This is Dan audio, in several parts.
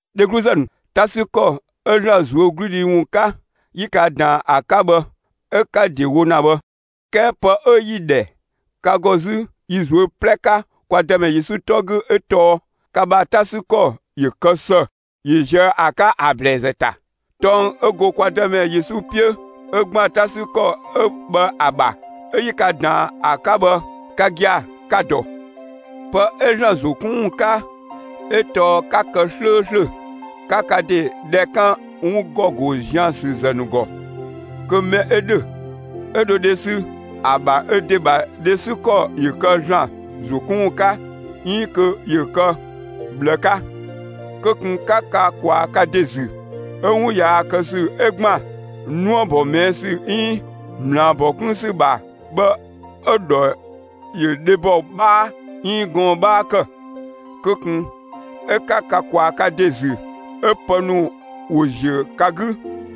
Dhegluzë ‑nu, 'ta 'sü ‑kɔ 'ö ‑Zlan ꞊zuögludhi ‑wun 'ka, 'yi ka ꞊daan ‑a 'ka bhë, 'ö 'ka‑ ‑de wo ‑na bhë. 'Kɛɛ pë 'ö 'yi‑ ‑dhɛ ka ‑gɔ 'zü yi ꞊zuö' 'plɛ 'ka kwa Dëmɛ Yesu 'tɔ 'gü 'ö tɔɔ: Ka ‑bha 'ta 'sü ‑kɔ ‑yö kë ‑së ‑yö ꞊ziö' ‑a 'ka ‑a ‑blɛɛzë ‑ta. Tɔng 'ö go kwa Dëmɛ Yesu 'piö 'ö ‑gban 'ta 'sü ‑kɔ 'ö bhë ‑a ‑bha, 'ö 'yi ka ꞊daan ‑a 'ka bhë, ka gia‑ ka‑ ‑dɔ. Pë 'ö ‑Zlan ‑zo 'kun ‑wun 'ka 'ö tɔɔ 'ka kë 'slööslö 'ka ka ‑de dhɛ 'kan 'wun ‑gɔ ‑go zian ‑sü ‑zë ‑nu ‑gɔ! Kö mɛ 'ö ‑dhö, 'ö dho dhe ‑sü, ‑a ‑bha ö ‑de ‑bha dhe 'sü ‑kɔ ‑yö kë ‑Zlan ‑zo 'kun ‑wun 'ka 'iin kö ‑yö kë ꞊bhlë 'ka. Kö ꞊kun 'ka ka ꞊kwaa ka ‑de ‑zü 'ö 'wun yaa kë ‑sü 'ö ‑gban 'nuëbɔ ꞊mɛɛ' ‑sü 'iin ꞊mlaabɔ 'kun ‑sü ‑bha bhë 'ö‑ ‑dhɔ ‑yö dhebɔ 'bhaa 'iin gɔɔn‑ 'bhaa ‑kë; kö ꞊kun 'ö 'ka ka ꞊kwaa ka ‑de ‑zü 'ö pë ‑nu ‑wo ‑ziö ka 'gü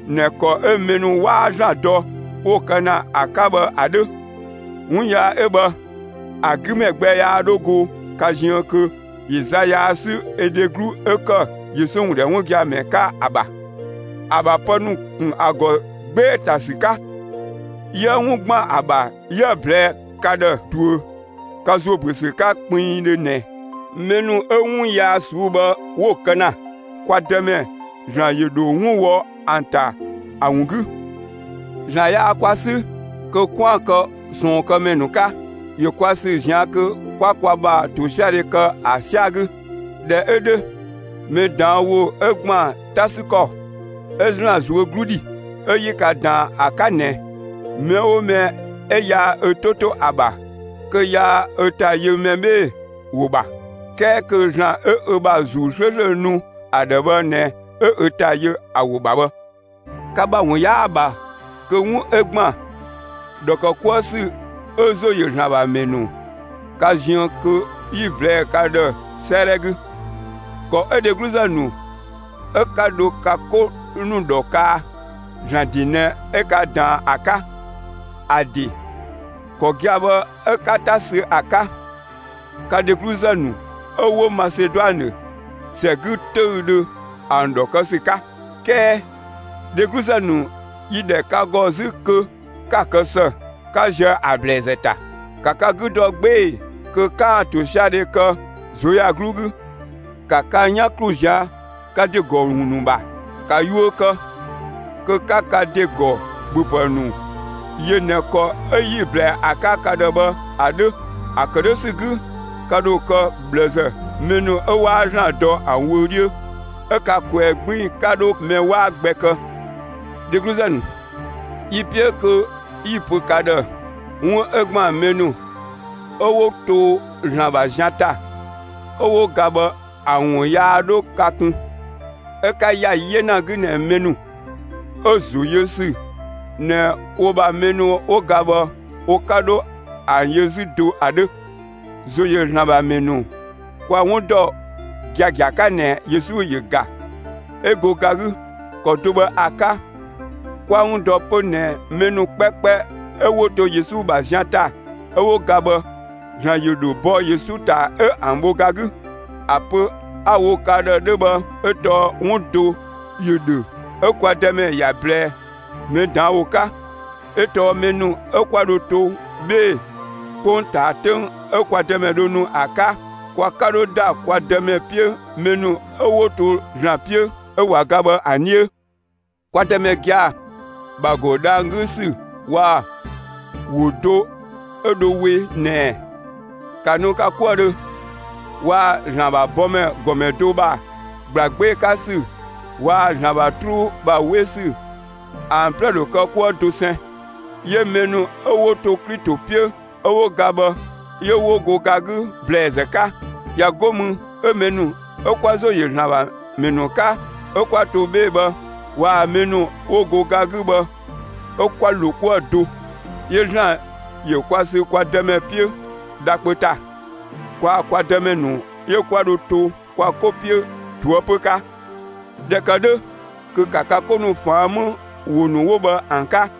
꞊nɛ ‑kɔ 'ö mɛ ‑nu 'waa ‑Zlan dɔ 'wo‑ kë ‑na ‑a 'ka bhë ‑a 'dhö! 'Wun yaa 'ö bhë ‑a 'gü mɛ gbɛ yaa 'dho go ka ziën kö ‑yö za yaa 'sü ö dheglu 'ö ‑kë Yesu ‑wun ‑dhɛ 'wun gia‑ ‑mɛ 'ka ‑a ‑bha, ‑a ‑bha pë ‑nu ‑kun ‑a ‑gɔ 'gbee‑ ‑ta ‑sü 'ka! 'Yië 'wun ‑gban ‑a ‑bha 'yië‑ ꞊blɛɛ'‑ ka ‑dhë ꞊duö ka ‑zo ‑büö ‑sü 'ka pinpiindhö ꞊nɛ: Mɛ ‑nu 'ö 'wun yaa ꞊suu'‑ bhë 'ö‑ kë ‑na, kwa Dëmɛ ‑Zlan ‑yö ‑dho 'wun wɔ ‑an ‑ta ‑a ‑wun 'gü. ‑Zlan yaa kwa 'sü kö 'kwaan‑ kë ꞊sɔɔnkëmɛ ‑nu 'ka; ‑yö kwa ‑sü ꞊zian' kö 'kwa kwa ‑bha ‑tosiadhe kë ‑a 'sɛa‑ 'gü. ꞊Dhɛ 'ö 'dhö mɛ ꞊daan' ‑wo 'ö ‑gban 'ta 'sü ‑kɔ 'ö ‑Zlan ꞊zuö' 'glu dhi 'ö 'yi ka ꞊daan ‑a 'ka ꞊nɛ, mɛ 'oo mɛ 'ö yaa ö 'to 'to ‑a ‑bha, kö yaa ö ‑ta yö mɛ 'bhee‑ ‑wo ‑bha, 'kɛɛ kö ‑Zlan 'ö ö ‑bha ‑Zuu 'slööslö nu ‑a ‑dhë bhë ꞊nɛ 'ö ö ‑ta yö ‑a ‑wo ‑bha bhë. Ka ‑bha ‑wun 'yaa‑ ‑bha kö 'wun 'ö ‑gban ‑dhɔ ‑kë 'kuë ‑sü 'ö ‑zo ‑yö ‑Zlan ‑bha ‑mɛ ‑nu ka ziën kö 'yi‑ ꞊blɛɛ' ka ‑dhë 'sëëdhɛ 'gü. ‑Kɔ 'ö dhegluzë ‑nu 'ö 'ka dho ka 'ko ‑nu ‑dhɔ kaa, ‑Zlan ‑de ꞊nɛ 'ö ka ꞊daan ‑a 'ka. ‑A ‑de ‑kɔ gia‑ bhë 'ö 'ka 'ta sü ‑a 'ka, ka dhegluzë ‑nu, 'ö 'wo Maseduanë ‑sɛ 'gü 'töüdhö, ‑an ‑dhɔ kë ‑sü 'ka. 'Kɛɛ, dhegluzë ‑nu, yi‑ ‑dhɛ ka ‑gɔ 'zü kö 'ka‑ kë ‑së, 'ka ziö ‑a ‑blɛɛzë ‑ta! ‑Ka ka 'gü dɔ 'gbee‑ kö 'ka ‑tosiadhe kë ꞊zuöyagluu 'gü! ‑Ka ka 'yan ‑klu ꞊zian' ka ‑de ‑gɔ 'wun ‑nu ‑bha! ‑Ka yuö kë, kö 'ka ka ‑de ‑gɔ ‑bhöpë ‑nu yö ꞊nɛ ‑kɔ 'ö 'yi‑ ꞊blɛɛ ‑a 'ka ka ‑dhë bhë ‑a 'dhö! ‑A ‑kë 'dhö ‑sü 'gü, ka ‑dho kë ꞊bhlëzë, mɛ ‑nu 'ö 'waa ‑Zlan dɔ ‑an wö 'dhiö, 'ö ka ꞊kwɛɛ‑ 'gbiin‑ 'ka 'dho mɛ 'waa gbɛ kë. Dhegluzë ‑nu, yi‑ 'piö kö 'yi‑ pö ka ‑dhë 'wun 'ö ‑gban mɛ ‑nu ('ö 'wo to ‑Zlan ‑bha zian ‑ta) 'ö 'wo ga bhë ‑a ‑wun yaa 'dho ka kun, 'ö 'ka ‑ya 'yena 'gü ꞊nɛ mɛ ‑nu 'ö ‑zo yö ‑sü ꞊nɛ wo ‑bha mɛ ‑nu 'wo ga bhë wo 'ka 'dho ‑an yö 'zü do ‑a 'dhö. ‑Zo ‑yö ‑Zlan ‑bha ‑mɛ ‑nu, kwa‑ 'wun ‑dɔ giagia 'ka ꞊nɛ Yesu ‑yö ‑ga; 'ö go ga 'gü. ‑Kɔ do bhë ‑a 'ka, kwa‑ 'wun ‑dɔ 'pö ꞊nɛ mɛ ‑nu 'kpɛkpɛ 'ö 'wo to Yesu ‑bha zian ‑ta 'ö 'wo ga bhë, ‑Zlan ‑yö ‑dho bɔ Yesu ‑ta 'ö ‑an bho ga 'gü. ‑A pö 'a‑ wo ka ‑dhë 'dhö bhë 'ö tɔɔ 'wun do ‑yö ‑dhö 'ö kwa Dëmɛ ‑ya ꞊blɛɛ mɛ ꞊daan' wo 'ka; 'ö tɔɔ mɛ ‑nu 'ö 'kwa dho to 'bhee‑ 'kpongtaa, 'töng 'ö kwa Dëmɛ dho nu ‑a 'ka, kwa 'ka 'dho ‑da kwa Dëmɛ 'piö mɛ ‑nu 'ö 'wo to ‑Zlan 'piö 'ö ꞊wa ga bhë ‑an 'dhiö. Kwa Dëmɛ gia‑ ‑bha ‑go dhang‑ 'gü ‑sü waa‑ ‑wo do 'ö dho we ꞊nɛɛ: «‑Ka nu ka 'kuëdhö!» waa‑ ‑Zlan ‑bha bɔmɛ ‑gɔmɛ do ‑bha ‑gbla 'gbee‑ 'ka ‑sü waa‑ ‑Zlan ‑bha 'truu ‑bha 'we ‑sü ‑an 'plɛ ‑dho kë 'kuë‑ dosɛn, 'yö mɛ ‑nu 'ö 'wo to Klito 'piö 'ö 'wo ga bhë 'yö 'wo go ga 'gü ‑blɛɛzë 'ka. ꞊Ya 'go mü 'ö mɛ ‑nu 'ö 'kwa ‑zo ‑yö ‑Zlan ‑bha ‑mɛ ‑nu 'ka 'ö 'kwa to 'bhee‑ bhë waa‑ mɛ ‑nu 'wo go ga 'gü bhë 'ö 'kwa ‑lo 'kuë‑ do, 'yö ‑Zlan ‑yö kwa sü kwa Dëmɛ 'piö dha kpö ‑ta. Kwaa‑ kwa Dëmɛ ‑nu 'yö 'kwa dho to kwa 'ko 'piö ꞊toëpö 'ka. ꞊Dhɛ ‑kë 'dhö kö ‑ka ka 'ko ‑nu ꞊faan' 'më ‑wo ‑nu 'wo bhë ‑an 'ka!